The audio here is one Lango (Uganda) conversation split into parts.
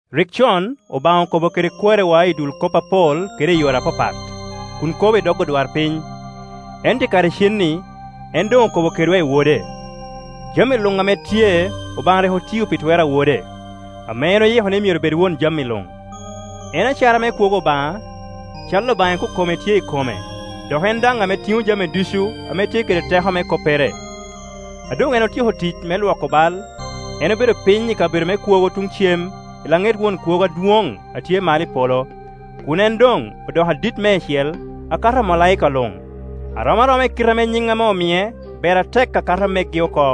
Rik con Obaŋa okobo kede kwariwa i dul kop apol kede i yore apapat, kun kobo i dog odwarpiny; ento i kare icen-ni en doŋ okobo kedwa i Wode. Jami luŋ ame tye Obaŋa rik otio pi twer a Wode, ame en oyiko ni myero bed won jami luŋ. En acara me kwogo Obaŋa, cal Obaŋa ikokome tye i kome, dok en daŋ ame tiŋo jami ducu ame tye kede teko me koppere, A doŋ en otyeko tic me lwoko bal, en obedo piny i kabedo me kwogo tuŋ cem i laŋet Won Kwogo Adwoŋ a tye malo i polo, kun en doŋ odoko adit meicel akato omalaika luŋ, a rom aroma i kite ame nyiŋ ame omie ber atek akato megi oko.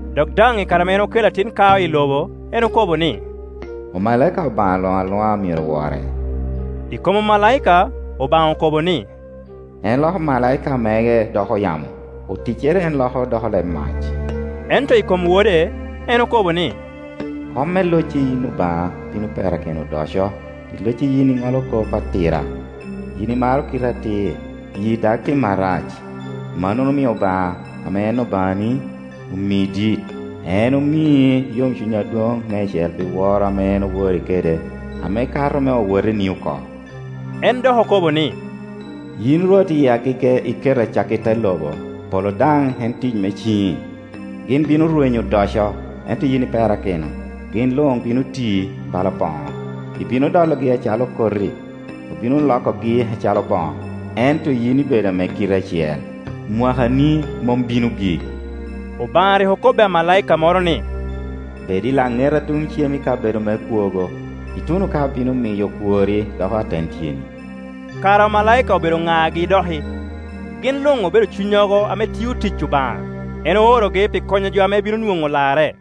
Dok daŋ i kare ame en okelo atin kao i lobo en okobo ni, “Omalaika Obaŋa luŋ aluŋa myero wore.” I kom omalaika, Obaŋa okobo ni, “En loko omalaika mege doko yamo, oticcere en loko doko leb mac,” Ento i kom Wode en okobo ni “Kom me, locci, yin Obaŋa, bino perakino odoco, i locci yin i ŋolo kop atira, Yin imaro kite atir, yii dag tim arac; mannono omio Obaŋa, ame en Obaŋani, omi dit, en omi yomcuny adwoŋ meicel pi woro ame en owori kede, ame kato me owoteni oko.” En dok okobo ni, “Yin Rwot i agege iketo acakki te lobo, polo daŋ en tic me ciŋi, Gin bino rwenyo odoco, ento yin iperakino; gin luŋ bino ti bala boŋo, ibino dologi acalo koti, obino lokogi acalo boŋo. Ento yin ibedo ame kiti acel, omwaka ni mom bino gik,” Obaŋa rik okobbi amalaika moro ni, “Bed i laŋeta tuŋ cem i kabedo me kwogo, ituno ka abino miyo okworri doko aten tyeni?” Kara omalaika obedo ŋagi doki? Gin luŋ obedo cunnyogo ame tio tic Obaŋa; en orogi pi konyo jo ame bino nwoŋo larre.